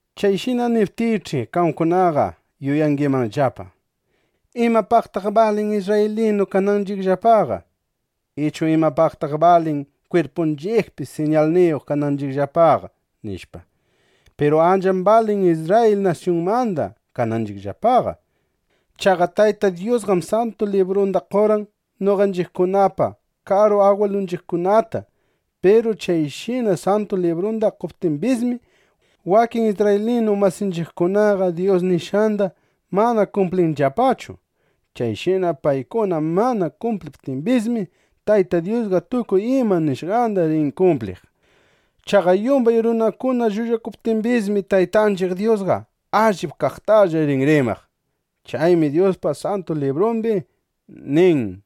Chayshina niptiych'i, qamkunaqa yuyangimanllapa: ¿Imapaqtaq balin isrraylinu kananchiqllapaqa? Ichu ¿imapaqtaq balin kwirpunchiqpi siñalniyuq kananchiqllapaqa? nishpa. Piru ancham balin Isrrayil nasyunmanda kananchiqllapaqa. Chaqa Tayta Dyusqam Santu Librunda qorqan noqanchiqkunapa karu agwilunchiqkunata. Piru chayshina Santu Librunda qoptimbismi, wakin isrraylinu masinchiqkunaqa Dyus nishqanda mana kumplinllapachu. Chayshina paykuna mana kumpliptimbismi, Tayta Dyusqa tukuy ima nishqanda rin kumpliq. Chaqa yumbay runakuna llullakuptimbismi, Taytanchiq Dyusqa allip kaqtalla rin rimaq. Chaymi Dyuspa Santu Librumbi nin: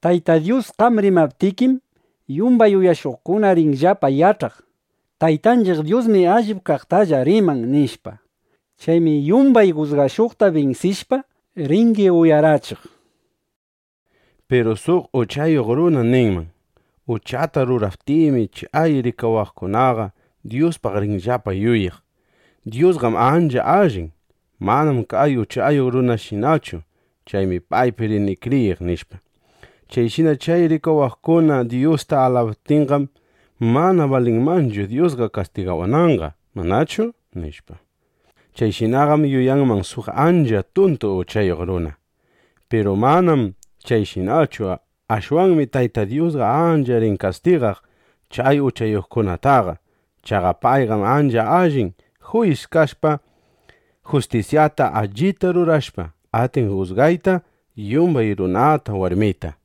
Tayta Dyus, qam rimaptikim, yumbay uyashuqkuna rinllapa yach'aq: Taytanchiq Dyusmi allip kaqtalla riman, nishpa. Chaymi yumbay jusgashuqta binsishpa, ringi uyarachiq, nishpa. Piru suq uchayuq runa ninman: “Uchata ruraptiymi, chay rikawaqkunaqa Dyuspaq rinllapa yuyaq: ‘Dyusqam ancha allin. Manam kay uchayuq runashinachu. Chaymi paypi rini kriyiq’, nishpa. Chayshina chay rikawaqkuna Dyusta alabaptinqam, mana balinmanchu Dyusqa kastigawananqa, ¿manachu?” nishpa. (Chayshinaqam yuyanman suq ancha tuntu uchayuq runa.) Piru manam chayshinachu. Ashwanmi Tayta Dyusqa ancha rin kastigaq chay uchayuqkunataqa. Chaqa payqam ancha allin juyis kashpa, justisyata allita rurashpa, atin jusgayta yumbay runata, warmita.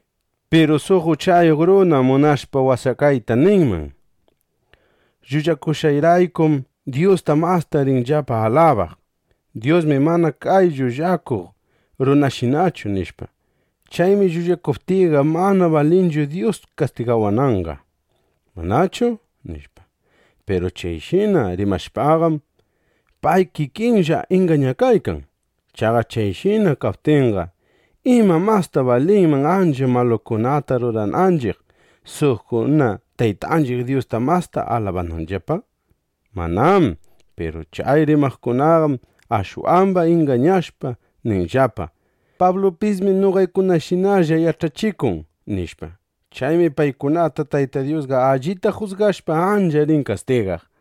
Piru suq uchayuq runa munashpa washakayta ninman: “Llullakushqayraykum Dyusta masta rinllapa alabaq: ‘Dyusmi mana kay llullakuq runashinachu’ nishpa. Chaymi llullakuptiyqa, mana balinchu Dyus kastigawananqa, ¿manachu?” nishpa. Piru chayshina rimashpaqam, pay kikinlla ingañakaykan. Chaqa chayshina kaptinqa, ¿ima, masta balinman ancha malukunata rurananchiq, suqkuna Taytanchiq Dyusta masta alabananllapa? ¡Manám! Piru chay rimaqkunaqam ashwamba ingañashpa ninllapa: “Pablupismi noqaykunashinalla yach'achikun”, nishpa. Chaymi paykunata Tayta Dyusqa allita jusgashpa, ancha rin kastigaq.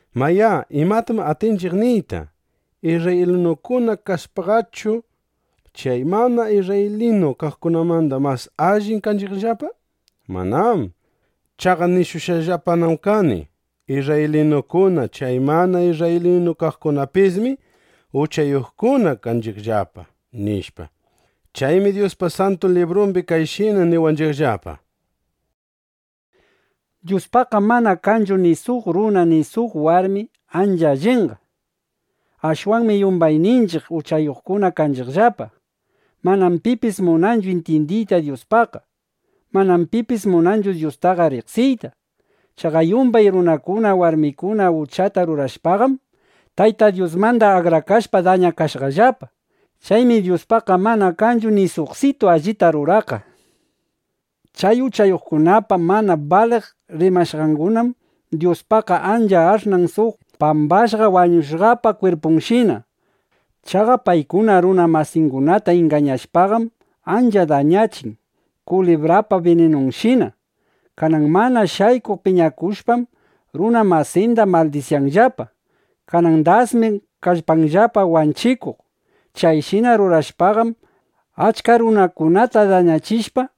Mayá, ¿imatam atinchiq niyta? ¿Isrraylinukuna kashpaqachu, chay mana isrraylinu kaqkunamanda mas allin kanchiqllapa? ¡Manám! Chaqa nishushqallapanam kani: Isrraylinukuna, chay mana isrraylinu kaqkunapismi uchayuqkuna kanchiqllapa, nishpa. Chaymi Dyuspa Santu Librumbi kayshina niwanchiqllapa: Dyuspaqqam mana kanchu ni suq runa ni suq warmi ancha allinqa. Ashwanmi yumbayninchiq uchayuqkuna kanchiqllapa. Manam pipis munanchu intyindiyta Dyuspaqqa. Manam pipis munanchu Dyustaqa riqsiyta. Chaqa yumbay runakuna, warmikuna uchata rurashpaqam, Tayta Dyusmanda akrakashpa, dañakashqallapa. Chaymi Dyuspaqqa mana kanchu ni suqsitu allita ruraqqa. Chay uchayuqkunapa mana baliq rimashqangunam Dyuspaqqa ancha ash'nan suq pambashqa wañushqapa kwirpunshina. Chaqa paykuna runa masingunata ingañashpaqam, ancha dañachin kulibrapa bininunshina. Kanan mana shaykuq piñakushpam, runa masinda maldisyanllapa. Kanan dasmi kallpanllapa wanchikuq. Chayshina rurashpaqam, achka runakunata dañachishpa,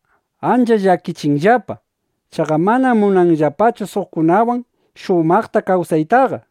ancha llakichinllapa. Chaqa manam munanllapachu suqkunawan shumaqta kawsaytaqa.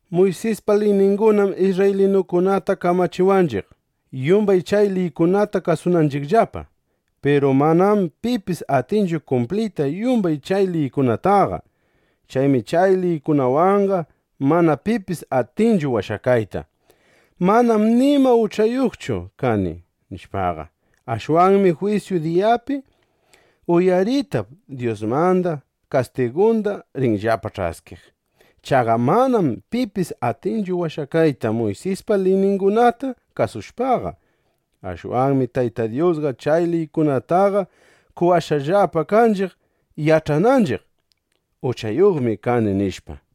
Muysispa liyningunam isrraylinukunata kamachiwanchiq, yumbay chay liykunata kasunanchiqllapa. Piru manam pipis atinchu kumpliyta yumbay chay liykunataqa. Chaymi chay liykunawanqa mana pipis atinchu washakayta: Manam nima uchayuqchu kani, nishpaqa. Ashwanmi jwisyu diyapi uyaritap Dyusmanda kastigunda rinllapa ch'askiq. Chaqa manam pipis atinchu washakayta Muysispa liyningunata kasushpaqa. Ashwanmi Tayta Dyusqa chay liykunataqa qowashqallapa kanchiq, yach'ananchiq: Uchayuqmi kani, nishpa.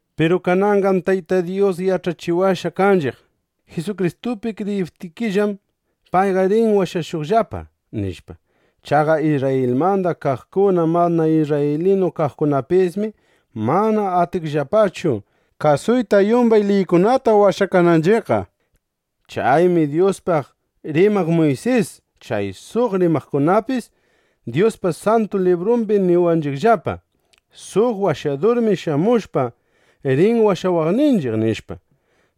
Piru kananqam Tayta Dyus yach'achiwashqa kanchiq: Jisukristupi kriyiptiykillam, payqa rin washashuqllapa, nishpa. Chaqa Isrrayilmanda kaqkuna, mana isrraylinu kaqkunapismi mana atinchiqllapachu kasuyta yumbay liykunata washakananchiqqa. Chaymi Dyuspaq rimaq Muysis, chay suq rimaqkunapis Dyuspa Santu Librumbi niwanchiqllapa: Suq Washadurmi shamushpa, rin washawaqninchiq, nishpa.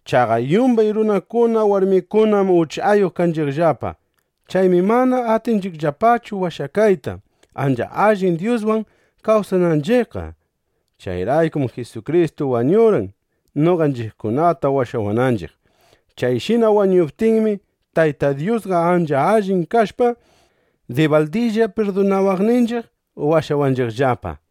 Chaqa yumbay runakuna, warmikunam uchayuq kanchiqllapa. Chaymi mana atinchiqllapachu washakayta, ancha allin Dyuswan kawsananchiqqa. Chayraykum Jisukristu wañurqan, noqanchiqkunata washawananchiq. Chayshina wañuptinmi, Tayta Dyusqa ancha allin kashpa, dibaldilla pirdunawaqninchiq, washawanchiqllapa.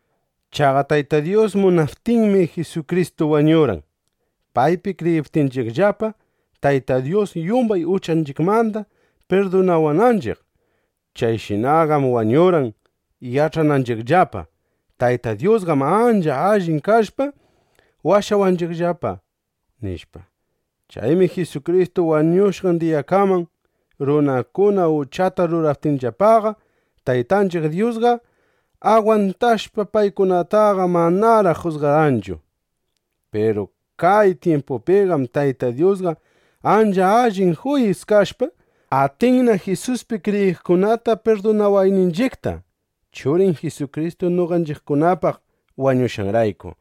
Chaqa Tayta Dyus munaptinmi, Jisukristu wañurqan, paypi kriyiptinchiqllapa, Tayta Dyus yumbay uchanchiqmanda pirdunawananchiq. Chayshinaqam wañurqan, yach'ananchiqllapa: Tayta Dyusqam ancha allin kashpa, washawanchiqllapa, nishpa. Chaymi Jisukristu wañushqan diyakaman, runakuna uchata ruraptinllapaqa, Taytanchiq Dyusqa agwantashpa, paykunataqa manaraq jusgarqanchu. Piru kay tyimpupiqam Tayta Dyusqa ancha allin juyis kashpa, atinna Jisuspi kriyiqkunata pirdunawayninchiqta, (Churin Jisukristu noqanchiqkunapaq wañushqanrayku).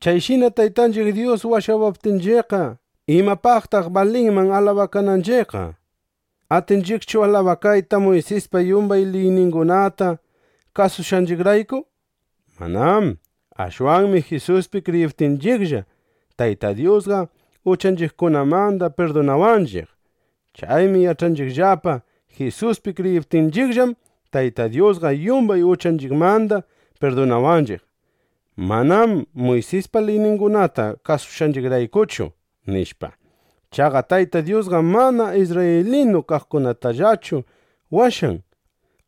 Chayshina Taytanchiq Dyus washawaptinchiqqa, ¿imapaqtaq balinman alabakananchiqqa? ¿Atinchiqchu alabakayta, Muysispa yumbay liyningunata kasushqanchiqrayku? Manám. Ashwanmi Jisuspi kriyiptinchiqlla, Tayta Dyusqa uchanchiqkunamanda pirdunawanchiq. Chaymi yach'anchiqllapa: Jisuspi kriyiptinchiqllam, Tayta Dyusqa yumbay uchanchiqmanda pirdunawanchiq; manam Muysispa liyningunata kasushqanchiqraykuchu, nishpa. Chaqa Tayta Dyusqam mana isrraylinu kaqkunatallachu washan.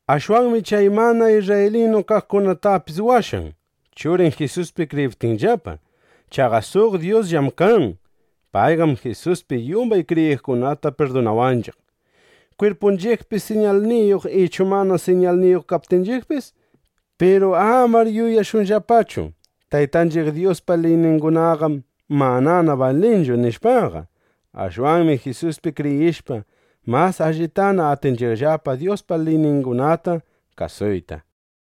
Ashwanmi chay mana isrraylinu kaqkunatapis washan, Churin Jisuspi kriyiptinllapa. Chaqa suq Dyusllam kan. Payqam Jisuspi yumbay kriyiqkunata pirdunawanchiq, kwirpunchiqpi siñalniyuq ichu mana siñalniyuq kaptinchiqpis. Piru amar yuyashunllapachu: Taytanchiq Dyuspa liyningunaqam manana balinchu, nishpaqa. Ashwanmi Jisuspi kriyishpa, mas allitana atinchiqllapa Dyuspa liyningunata kasuyta.